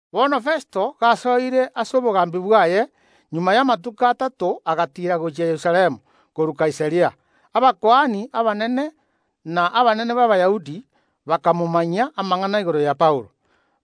Bono Festo gasoire ase obogambi bwaye, magega y’amatuko atato agatiira gochia Yerusalemu korwa Kaisaria. Abakuani abanene na abanene b’Abayahudi bakamomanyia amang’ana igoro ya Paulo.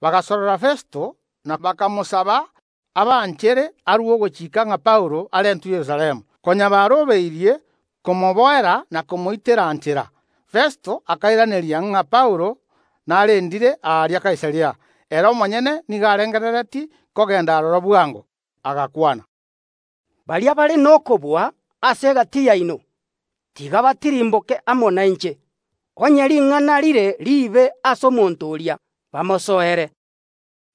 Bagasorora Festo, na bakamosaba abanchere, arue ogochika ng’a Paulo arentwe Yerusalemu, konya barobeirie komoboera na komoitera nchera. Festo akairaneria ng’a Paulo narendire aria Kaisaria; ere omonyene nigo arengereretie kogenda aroro bwango. Agakwana: “Baria bare nokobua ase egati yaino, tiga batirimboke amo nainche, onye ring’ana rire riibe ase omonto oria, bamosoere.”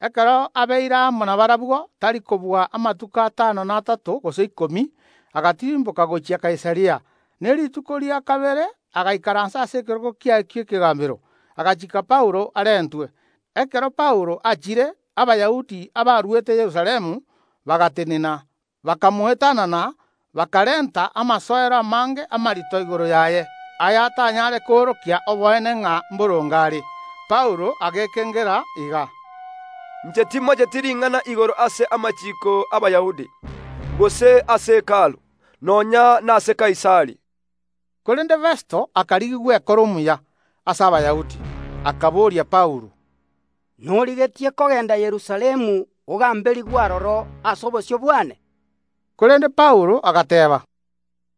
Ekero abeire amo nabarabwo tari kobua amatuko atano na atato gose ikomi, agatirimboka gochia Kaisaria; ne rituko ria kabere agaikaransa ase ekerogo kiaye gi’ekegambero, agachiika Paulo arentwe. Ekero Paulo achire, Abayahudi abarwete Yerusalemu bagatenena, bakamoetanana, bakarenta amasoero amange amarito igoro yaye, ayabatanyare koorokia oboene ng’a mboronge are. Paulo agekengera iga: “Inche timocheti ring’ana igoro ase amachiiko ’Abayahudi, gose ase Hekalu, nonya nase Kaisari.” Korende Festo akarigia gwekora omuya ase Abayahudi, akaboria Paulo: “Norigetie kogenda Yerusalemu ogamberigwe aroro ase obosio bwane?” Korende Paulo agateeba: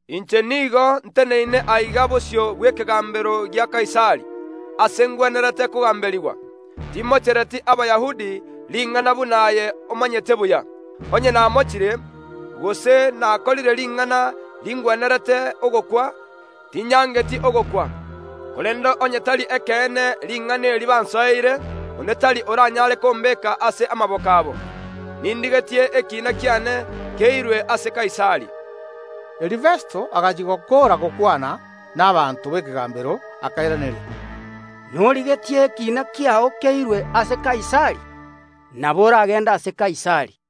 “Inche nigo nteneine aiga bosio bw’ekegambero gia Kaisari, ase ngwenerete kogamberigwa; timochereti Abayahudi ring’ana buna aye omanyete buya. Onye namochire, gose nakorire ring’ana ringwenerete ogokwa, tinyangeti ogokwa, korende onye tari ekeene ring’ana eri bansoereire, onde tari oranyare kombeka ase amaboko abo. Nindigetie ekiina kiane keirwe ase Kaisari.” Erio Festo agachia gokoora gokwana n’abanto b’ekegambero, akairaneria: “Norigetie ekiina kiao keirwe ase Kaisari, nabo oragende ase Kaisari.”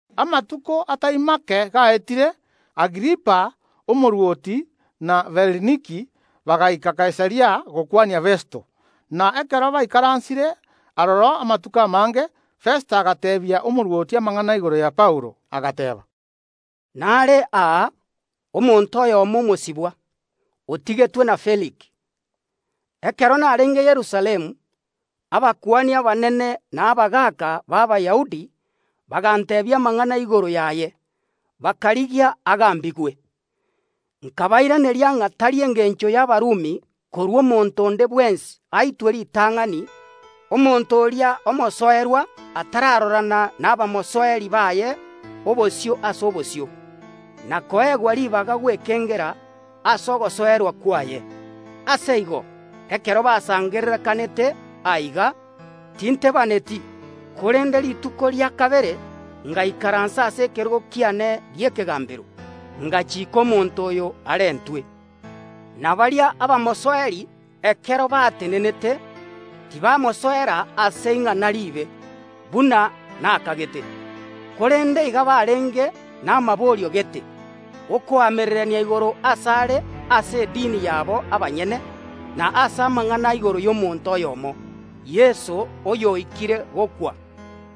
Amatuko atai make gaetire, Agripa omorwoti na Bereniki bagaika Kaisaria gokwania Festo. Na ekero baikaransire aroro amatuko amange, Festo agateebia omorwoti amang’ana igoro ya Paulo, agateeba: “Nare aa omonto oyomo omosibwa, otigetwe na Feliki. Ekero narenge Yerusalemu, abakuani abanene na abagaaka b’Abayahudi baganteebia amang’ana igoro yaye, bakarigia agambigwe. Nkabairaneria ng’a tari engencho y’Abarumi korua omonto onde bwensi aitwe ritang’ani omonto oria omosoerwa atararorana nabamosoeri baye obosio ase obosio, na koegwa ribaga gwekengera ase ogosoerwa kwaye. Ase igo ekero basangererekanete aiga, tintebaaneti, korende rituko ria kabere ngaikaransa ase ekerogo kiane gi’ekegambero, ngachiika omonto oyo arentwe. Na baria abamosoeri ekero batenenete, tibamosoera ase ing’ana riibe, buna nakagete, korende iga barenge namaborio gete, okoamererania igoro asare ase edini yabo abanyene, na ase amang’ana igoro y’omonto oyomo, Yeso, oyoikire gokwa,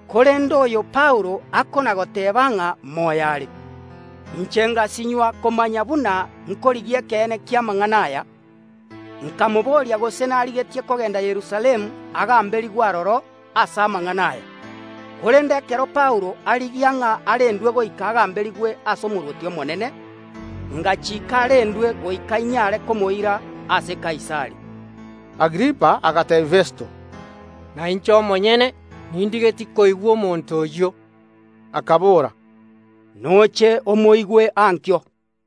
korende oyo Paulo akona‐goteeba ng’a moyo are. Inche ngasinywa komanya buna nkorigia ekeene ki’amang’ana aya, nkamobooria gose narigetie kogenda Yerusalemu agamberigwe aroro ase amang’ana aya. Korende ekero Paulo arigia ng’a arendwe goika agamberigwe ase Omorwoti omonene, ngachiika arendwe goika inyare komoira ase Kaisari.” Agripa agateebia Festo: “Nainche omonyene nindigetie koigwa omonto oyio.” Akabora: “Noche omoigwe ankio.”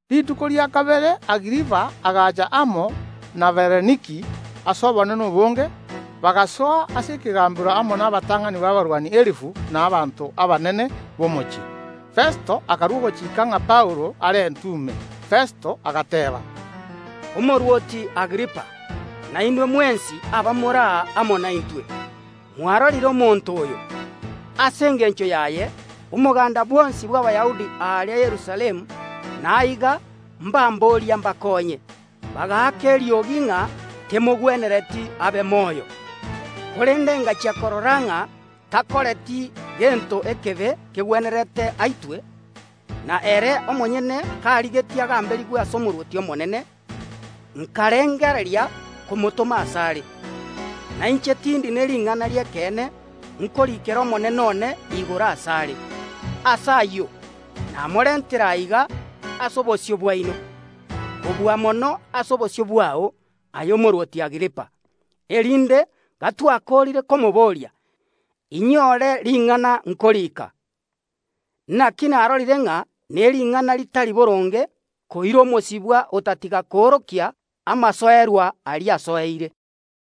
Rituko rikobwatia Agripa agaacha amo na Bereniki ase obonene obonge, bagasoa ase ekegambero amo nabatang’ani b’abarwani elifu na abanto abanene b’omochie. Festo akarua ogochika ng’a Paulo arentwe ime. Festo agateeba: “Omorwoti Agripa, na inwe mwensi abamore aa amo naintwe, mwarorire omonto oyo! Ase engencho yaye omogaanda bwonsi bw’Abayahudi aaria Yerusalemu na aiga mbamboria mbakoonye, bagaaka eriogi ng’a temogwenereti abe moyo. Korende ngachia korora ng’a takoreti gento ekebe kegwenerete aitwe; na ere omonyene karigetie agamberigwe ase Omorwoti omonene, nkarengereria komotoma asare. Na inche tindi ne ring’ana ri’ekeene nkoriikera omonene one igoro asare. Ase ayio namorentire aiga ase obosio bwaino, kobua mono ase obosio bwao, aye omorwoti Agripa, erinde gotwakoorire komobooria, inyore ring’ana nkorika. Naki narorire ng’a nering’ana ritari boronge koira omosibwa otatiga koorokia amasoerwa aria asoereire.”